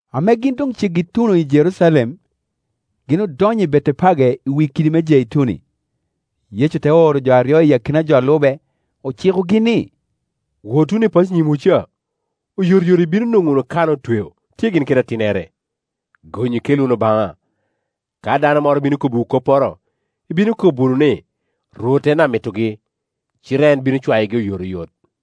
Ame gin doŋ ceggi i tuno i Jerucalem, gin odonyo i Betepage i wi kidi me Jeituni. Yecu te oro jo aryo i akina jo a lube. Ocikogi ni, “Wot wunu i paco i nyimwu ca. Oyotoyot ibino wunu nwoŋo kana ame otweo, tye gin kede atinnere; gonyu, ikel wunu baŋa. Ka dano moro bino kobbiwu kopporo, ibino kobo wunu ni, ‘Rwot en ame amitogi’, cite en bino cwayogi oyotoyot.”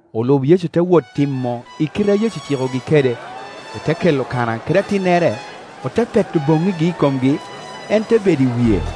Olub Yecu te wot timo i kite a Yecu ocikogi kede, ote kelo kana kede atinnere, ote peto boŋŋigi i komgi, en te bedo i wie.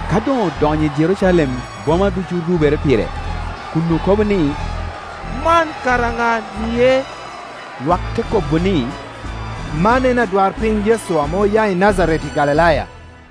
Ka doŋ odonyo i Jerucalem boma ducu orubere pire, kun okobo ni, “Man kara ŋa-nie?” Lwak te kobo ni, “Man en adwarpiny Yecu ame oya i Najareti i Galilaya.”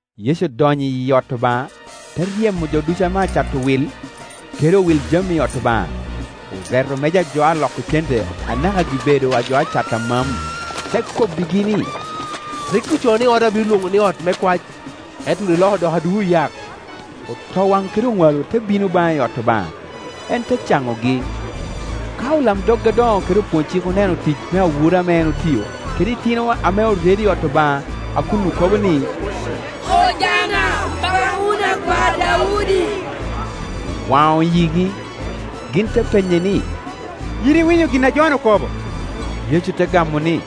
Yecu odonyo i ot Obaŋa, te ryemo jo ducu ame aceto wil kede owil jami i ot Obaŋa. Oreto meja a jo a loko cente anaka gi-bedo a jo aceto amam, te kobbigi ni, “Rik ocoo ni, ‘Oda obino lwoŋo ni ot me kwac’, ento wun iloko wunu odoko aduu oyak.” Otowaŋ kede oŋwalo te bino baŋe i ot Obaŋa, en te caŋogi. Ka olamdog adoŋo kede opwony-cik oneno tic me awura ame en otio, kede itino ame oredo i ot Obaŋa, a kun okobo ni, “Ojana, pak wunu Akwar Daudi,” owaŋo yigi. Gin te penye ni, “Yin iwinyo gin a jo-nu okobo?” Yecu te gamo ni,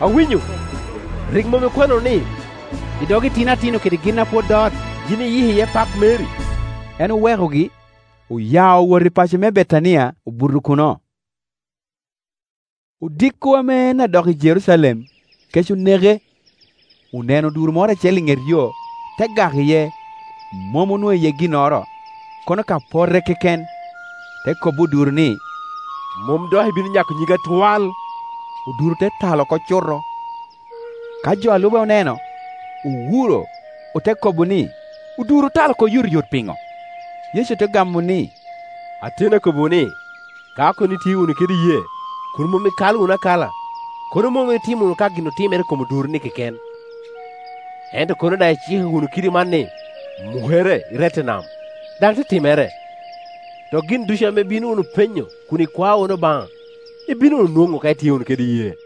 “Awinyo. Rik mom ikwano wunu ni, ‘I dog itino atino kede gin a pwod dot yin iyiko iye pak meri?’” En owekogi, oya owoto i paco me Betania, obuto kuno. Odiko ame en adok i Jerucalem, kec oneke. Oneno oduro moro acel i ŋetyo, te gak iye; mom onwoŋo iye ginnoro, kono ka pote keken. Te kobbi oduro ni, “Mom dok ibino nyako nyiggi atwal.” Oduro te tal oko cuto. Ka jo a lube oneno, owuro, ote kobo ni, “Oduro otal oko oyotoyot piŋo?” Kor. 13.2Yecu te gamo ni, “Ateni akobbi-wu ni, ka kono itye wunu kede iyee, kun mom ikalo wunu akala, kono mom itimo wunu ka gin otimere i kom oduro-ni keken, ento kono daŋ iciko wunu kidi man ni, ‘Mukere, rette i nam’ daŋ te timere. Dok gin ducu ame ibino wunu penyo kun ikwao wunu Obaŋa ibino wunu nwoŋo ka itye wunu kede iyee.”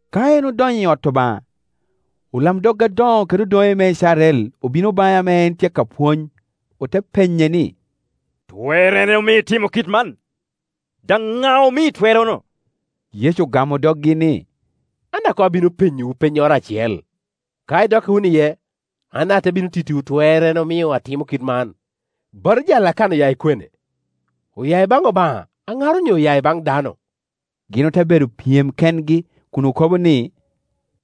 Ka en odonyo i ot Obaŋa, olamdog adoŋo kede odoŋe me Icrael obino baŋe ame en tye ka pwony, ote penye ni, “Twerrene omio itimo kit man? Daŋ ŋa omii twerrono?” Yecu ogamo doggi ni, “An daŋ koŋ abino penyowu pennyoro acel; ka idokka wunu iye, an daŋ ate bino tittiwu twerrene omio atimo kit man. Batija a Lakana oya i kwene? Oya i baŋ Obaŋa aŋar onyo oya i baŋ dano?” Gin ote bedo pyem kengi kun okobo ni,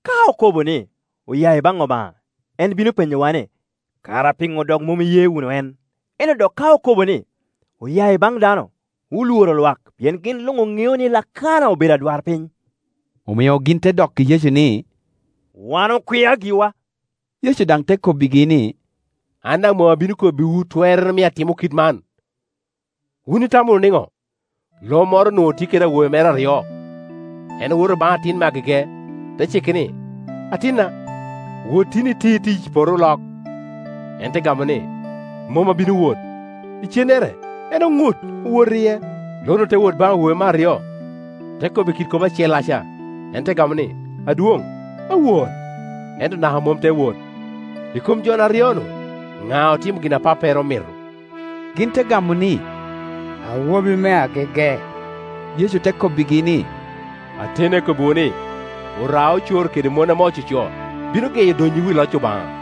“Ka okobo ni, ‘Oya baŋ Obaŋa’, en bino penyowa ni, ‘Kara piŋo dok mom iye wunu en!’ Ento dok ka okobo ni, ‘Oya baŋ dano’, olworo lwak; pien gin luŋ oŋeo ni Lakana obedo adwarpiny.” Omio gin te dokki Yecu ni, “Wan okwia giwa.” Yecu daŋ te kobbigi ni, “An daŋ mom abino kobbiwu twerrene omio atimo kite man. “Wun itamo wunu niŋo? Lo moro onwoŋo tye kede awobe mere aryo. En owoto baŋ atin me agege, te cike ni, ‘Atinna, wot tin iti tic i poto olok.’ En te gamo ni, ‘Mom abino wot’; icennere en oŋut, owoto iye. Lo-nu te wot baŋ awo bi me aryo, te kobbe kite kop acellaca; en te gamo ni, ‘Adwoŋ, awot’, ento naka mom te wot. I kom jo-nu aryo-nu ŋa ame otimo gin a pappere omito?” Gin te gamo ni, “Awobi me agege.” Yecu te kobbigi ni, “Ateni akobbiwu ni, oraocoro kede mon ame ococo bino geyo donnyiwu i loc Obaŋa.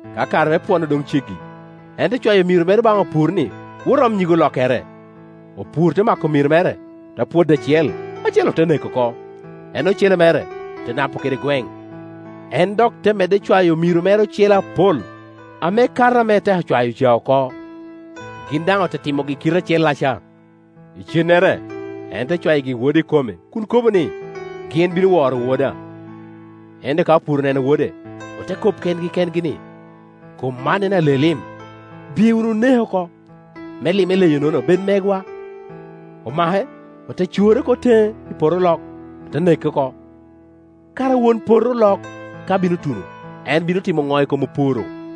Ka kare me pwono doŋ ceggi, en te cwayo omiro mere baŋ opur ni wot om nyig olokkere. Opur te mako omiro mere, ote pwodo acel, acel ote neko oko, en ocele mere ote napo kede gweŋ. En dok te medde cwayo omiro ocele apol ame kato ame eteko cwayo ca oko, gin daŋ ote timogi i kite acellaca. Icennere en te ewayigi wode ikome kun kobo ni, ‘Gin bino woro woda’ Ento ka opur oneno wode ote kobo kengi kengi ni, ‘Kom man en ale-lim: biye wunu, oneke oko, me lim eleyo: nono bed megwa.’ Omake ote core oko teŋe i poto olok, ote neke oko. Kara won poto olok ka bino tuno en bino timo ŋo i kom opur-ru?”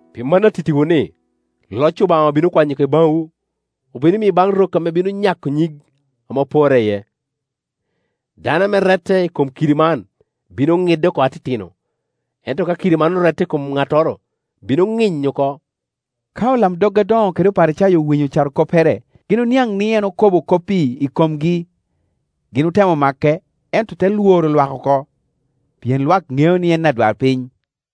Pi mano atittiwu ni, loc Obaŋa obino kwanyo oko i baŋwu, obino miyo baŋ rok ame bino nyako nyig ame oporre iye. [ Dano ame rette i kom kidi man, bino ŋidde oko atitino; ento ka kidi man orette i kom ŋattoro, bino ŋinyo oko.] Ka olamdog adoŋo kede Oparicayo owinyo carokoppere, gin oniaŋ ni en okobo kop-pi i komgi. Gin otemo make, ento ote lworo lwak oko pien lwak ŋeo ni en adwarpiny.”